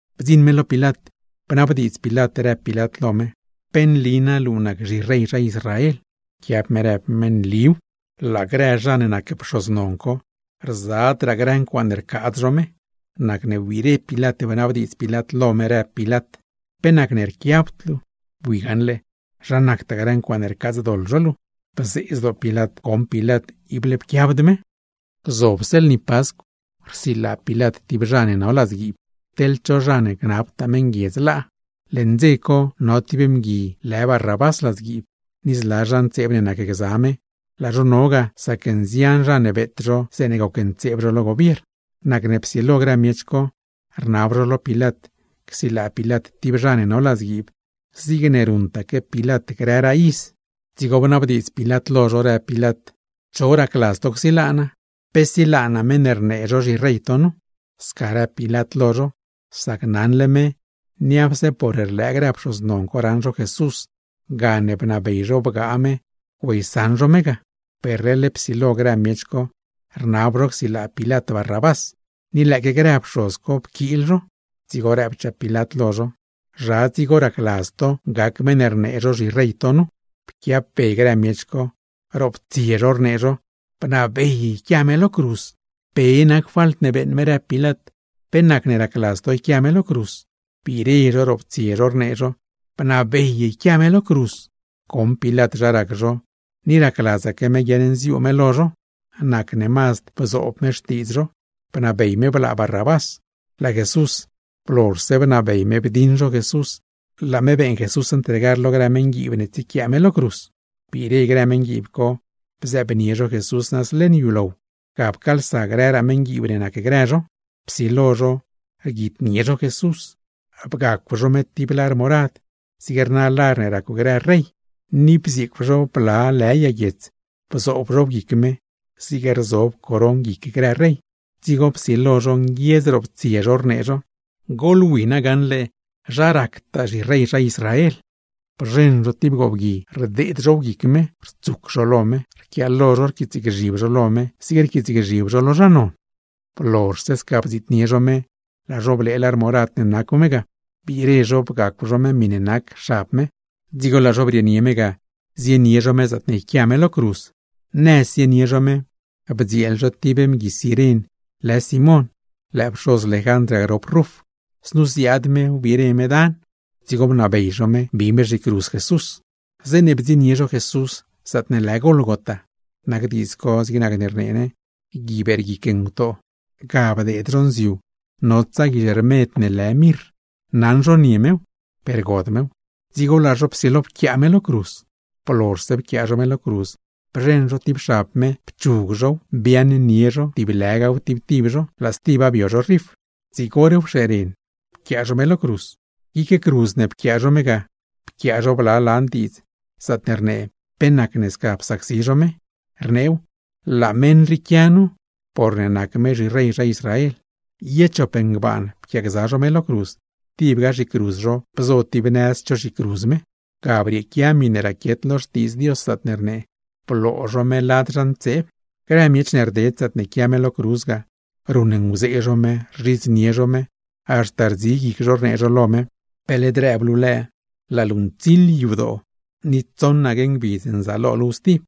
Bdziṉ me lo Pilat, bnabdiidz Pilat rëb Pilat lo me: ―¿Pe nli na luu nac zhirey zha Israel? Pquiab me rëb me: ―Nliw. Tibaque quia grë zha ne nac pxoz non, rzadraa grë ncuaaṉe rcaadz zho me. Nacne wbiire Pilat bnabdiidz Pilat lo me, rëb Pilat: ―¿Pe nacne rquiabd luu? Bui gaṉle zha nactaa grë ncuaaṉe rcaadzdoḻ zho luu. Bzee zdoo Pilat goṉ Pilat ible pquiabd me. Gzobse lni Pascw rsilaa Pilat tib zha ne no ladzguiib, teḻ cho zha ne gnabtaa meṉguiedz laa. Leṉ dze co no tib mgui lë Barrabás ladzguiib, ni zla zha ntseeb ne nacgza me, laa zho no ga sac nzian zha ne beet zho zeeṉe gocntseeb zho lo gobiern. Nacne psilo grë miech co, rnab zho lo Pilat csilaa Pilat tib zha ne no ladzguiib zigne ruṉtaque Pilat grëraa iz. Dzigo bnabdiidz Pilat lo zho, rëb Pilat: ―¿Cho racladz to csilaa naa? ¿Pe silaa naa meṉ ne rnee zho zhirey to nu? Sca rëb Pilat lo zho, sac naṉle me niapse por rlëë grë pxoz non co raṉ zho Jesús gane bnabey zho bgaa me güeysaṉ zho me ga. Per leḻ psilo grë miech co rnab zho csilaa Pilat Barrabás; ni lëëque grë pxoz co pquiil zho. Dzigo rëb Pilat lo zho: ―¿Zha dzigo racladz to gac meṉ rnee zho zhirey to nu? Pquiab be grë miech co, roptsie zho rnee zho: ―¡Bnabey yquia me lo cruz! ―¿Pe nac falt ne beeṉ me? ―rëb Pilat―. ¿Pe nacne racladz to yquia me lo cruz? Biire zho roptsie zho rnee zho: ―¡Bnabey yquia me lo cruz! Goṉ Pilat zha rac zho ni racladzaque me guiaṉnziuu me lo zho, nacne mazd bzoob me xtiidz zho, bnabey me blaa Barrabás; laa Jesús, blozhse bnabey me bdiṉ zho Jesús laa me beeṉ Jesús ntregar lo grë meṉguiib ne tsiequiaa me lo cruz. Biire grë meṉguiib co bzëëbnie zho Jesús nëz leṉ yulow, ga pcaalsa grëraa meṉguiib ne nacgrë zho. Psilo zho rguitnie zho me, bgacw zho me tib lar morad zig rna lar ne racw grë rey, ni bzieecw zho bla lë yag guiets bzoob zhow guic me, zig rzob coron guic grë rey. Dzigo psilo zho nguiedz roptsie zho rnee zho: ―¡Goḻwi gaṉle zha ractaa zhirey zha Israel! Bzheṉ zho tib goobgui, rdeed zhow guic me, rtsuc zho lo me, rquiaalo zho rquiitsgzhib zho lo me zig rquiitsgzhib zho lo zha non. Blozhse sca bdziitnie zho me, laa zho blee lar morad ne nacw me ga, biire zho bgacw zho me miṉe nac xab me; dzigo laa zho brieenie me ga zienie zho me zaatne yquia me lo cruz. Nëz zienie zho me, bdzieel zho tib mgui Ciren lë Simón (lëë pxoz Lejandr ga grop Ruf), znu ziaad me wbire me dan. Dzigo bnabey zho me bi me zhicruz Jesús. Zeeṉe bdziṉnie zho Jesús zaatne lë Gólgota (nac diidz co zig nac ne rnee ne “Gui Beerguic Ngutoo”); ga bdeed zho nziu notsa guizh rmed ne lë mirr, naṉ zho nie mew, per god mew. Dzigo laa zho pquiaa me lo cruz. Blozhse pquiaa zho me lo cruz, bzheṉ zho tib xab me pchug zhow, biaaṉnie zho tib lëgaw tib tib zho, laa stiba bio zho rif. Zig hor wxeeren ga pquiaa zho me lo cruz. Glaa guic cruz ne pquiaa zho me ga, ga pquiaa zho bla lan diidz zaatne rnee pe nacne sca psacsi zho me, rneew: “LËË MEṈ RII QUIA NU, PORNE NAC ME ZHIREY ZHA ISRAEL.” Ye chop ngbaan pquiaagza zho me lo cruz, tibga zhicruz zho bzo tib nëz cho zhicruz me. [Ga brieequia miṉe raquiet lo Xtiidz Dios, zaatne rnee: “Bloo zho me lad zha ntseeb.”] Grë miech ne rded zaatne quia me lo cruz ga, ruṉnguzee zho me, rzhidznie zho me, haxta rdzi guic zho rnee zho lo me: ―¡Pe led rëb luu lëë, laa luu ntsiḻ yadoo ni tsoṉaque ngbidz nzaalo luuw stib!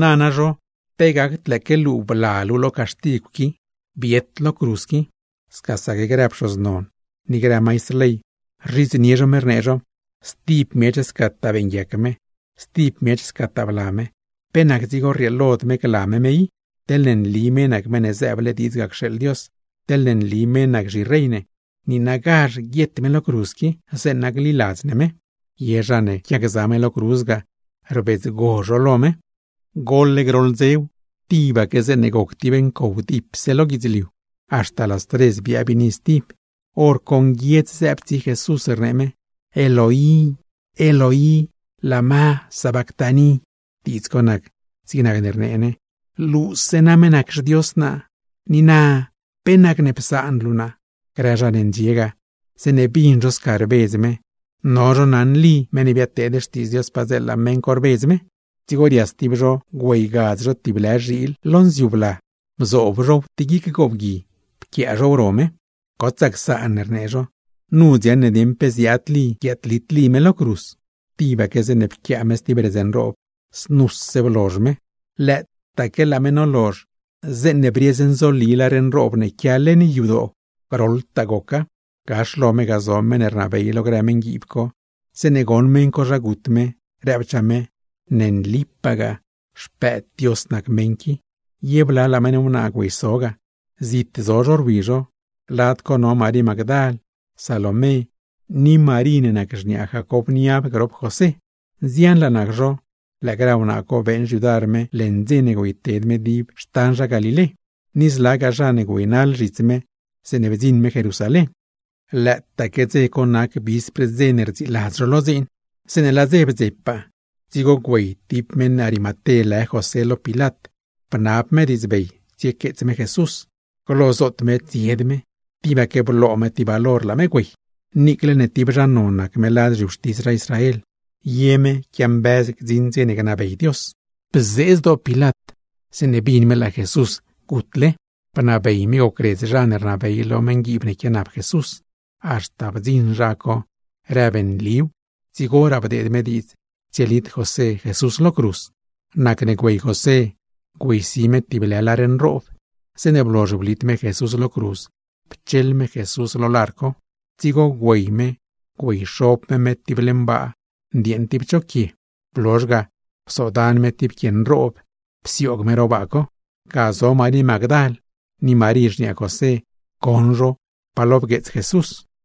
Nana zho, ¡pe gacd lëëque luu bla luu lo caxtigw qui, biet lo cruz qui! Scasaque grë pxoz non ni grë maistr ley, rzhidznie zho me; rnee zho: ―Stib miech scataa beeṉguiac me, stib miech scataa bla me, pe nac dzigo rrieelod me gla me me. ¡Teḻne nli me nac Meṉ ne zëëble diidz ga cxeeḻ Dios, teḻne nli me nac zhirey ne, niinagazh guiet me lo cruz; zeeṉa gliladz ne me! Ye zha ne quiagza me lo cruz ga, rbidzgo zho lo me. Goḻ groḻ dzew, tibaque zeeṉe goc tib ncow dipse lo guidzliu, haxta las tres biaa biini stib. Horco nguiedz zëëb tsi Jesús, rnee me: ―¡Eloi, Eloi! ¿Lama sabactani? (Diidz co nac zig nacne rnee ne: ¡Luuse name nac xDios naa! ¿Pe nacne psaan luu naa?) Grë zha ne ndxie ga, zeeṉe bin zho sca rbedz me, no zho naṉ Lí, meṉ ne biadteed xtiidz Dios padzeela, meṉ co rbedz me. Dzigo rias tib zho güeygadz tib lë zhiil lo nziu bla, bzoob zhow tib guic goobgui pquiaa zhow ro me. ―¡Gotsaa csaan ―rnee zho―, nu dziaṉ ne dieṉ pe ziaad Lí guiaadlit Lí me lo cruz! Tibaque zeeṉe pquiaa me stib redz nroob, znuse blozh me. Lëëtaaque laa me nolozh, zeeṉe briez nzoli lar nroob ne quia leṉ yadoo, groḻtaa goca. Gax lo me ga zo meṉ ne rnabey lo grë meṉguiib co, zeeṉe goṉ meṉ co zha gut me, rëbchaa me: ―¡Ne nligaa, Xpëëd Dios nac meṉ qui! Ye blalaa meṉ wnaa güeyso ga, zit zo zho rwi zho; lad co no Marí Magdal, Salomé ni Marí ne nac xniaa Jacob niab grop José. Nzianlaa nac zho, lëë grë wnaa co beeṉ xyudar me leṉ dze ne güeyted me dib xtan zha Galilé; ni zlagaa zha ne güeynaḻ zhits me zeeṉe bdziṉ me Jerusalén. Lëëtaaque dze co nac vispr dze ne rdziiladz zho lo dziin. Zeeṉe laa dze bdzepaa, dzigo güey José (meṉ Arimaté) lo Pilat bnab me diidzbey tsiequeets me Jesús. Glo zoot me tsied me, per tibaque bloo me tib valor güey me; niicle ne tib zha non nac me lad zhiwxtis zha Israel, ye me quiambëz gdziṉ dze ne gnabey Dios. Bzee zdoo Pilat zeeṉe bin me laa Jesús gutle. Bnabey me gocredz zha ne rnabey lo meṉguiib ne quianap Jesús; haxta bdziṉraa meṉ co rëb nliw, dzigoraa bdeed me diidz tsielit José Jesús lo cruz. Nacne güey José, güeysi me tib lë lar nroob. Zeeṉe blozh blit me Jesús lo cruz pcheḻ me Jesús lar co, dzigo güeyxob me me tib leṉ baa ne ndieeṉ tib cho quie. Blozh ga, psodan me tib quie nroob psioog me ro baa co. Ga zo Marí Magdal ni Marí xniaa José, goṉ zho pa lo bgueets me.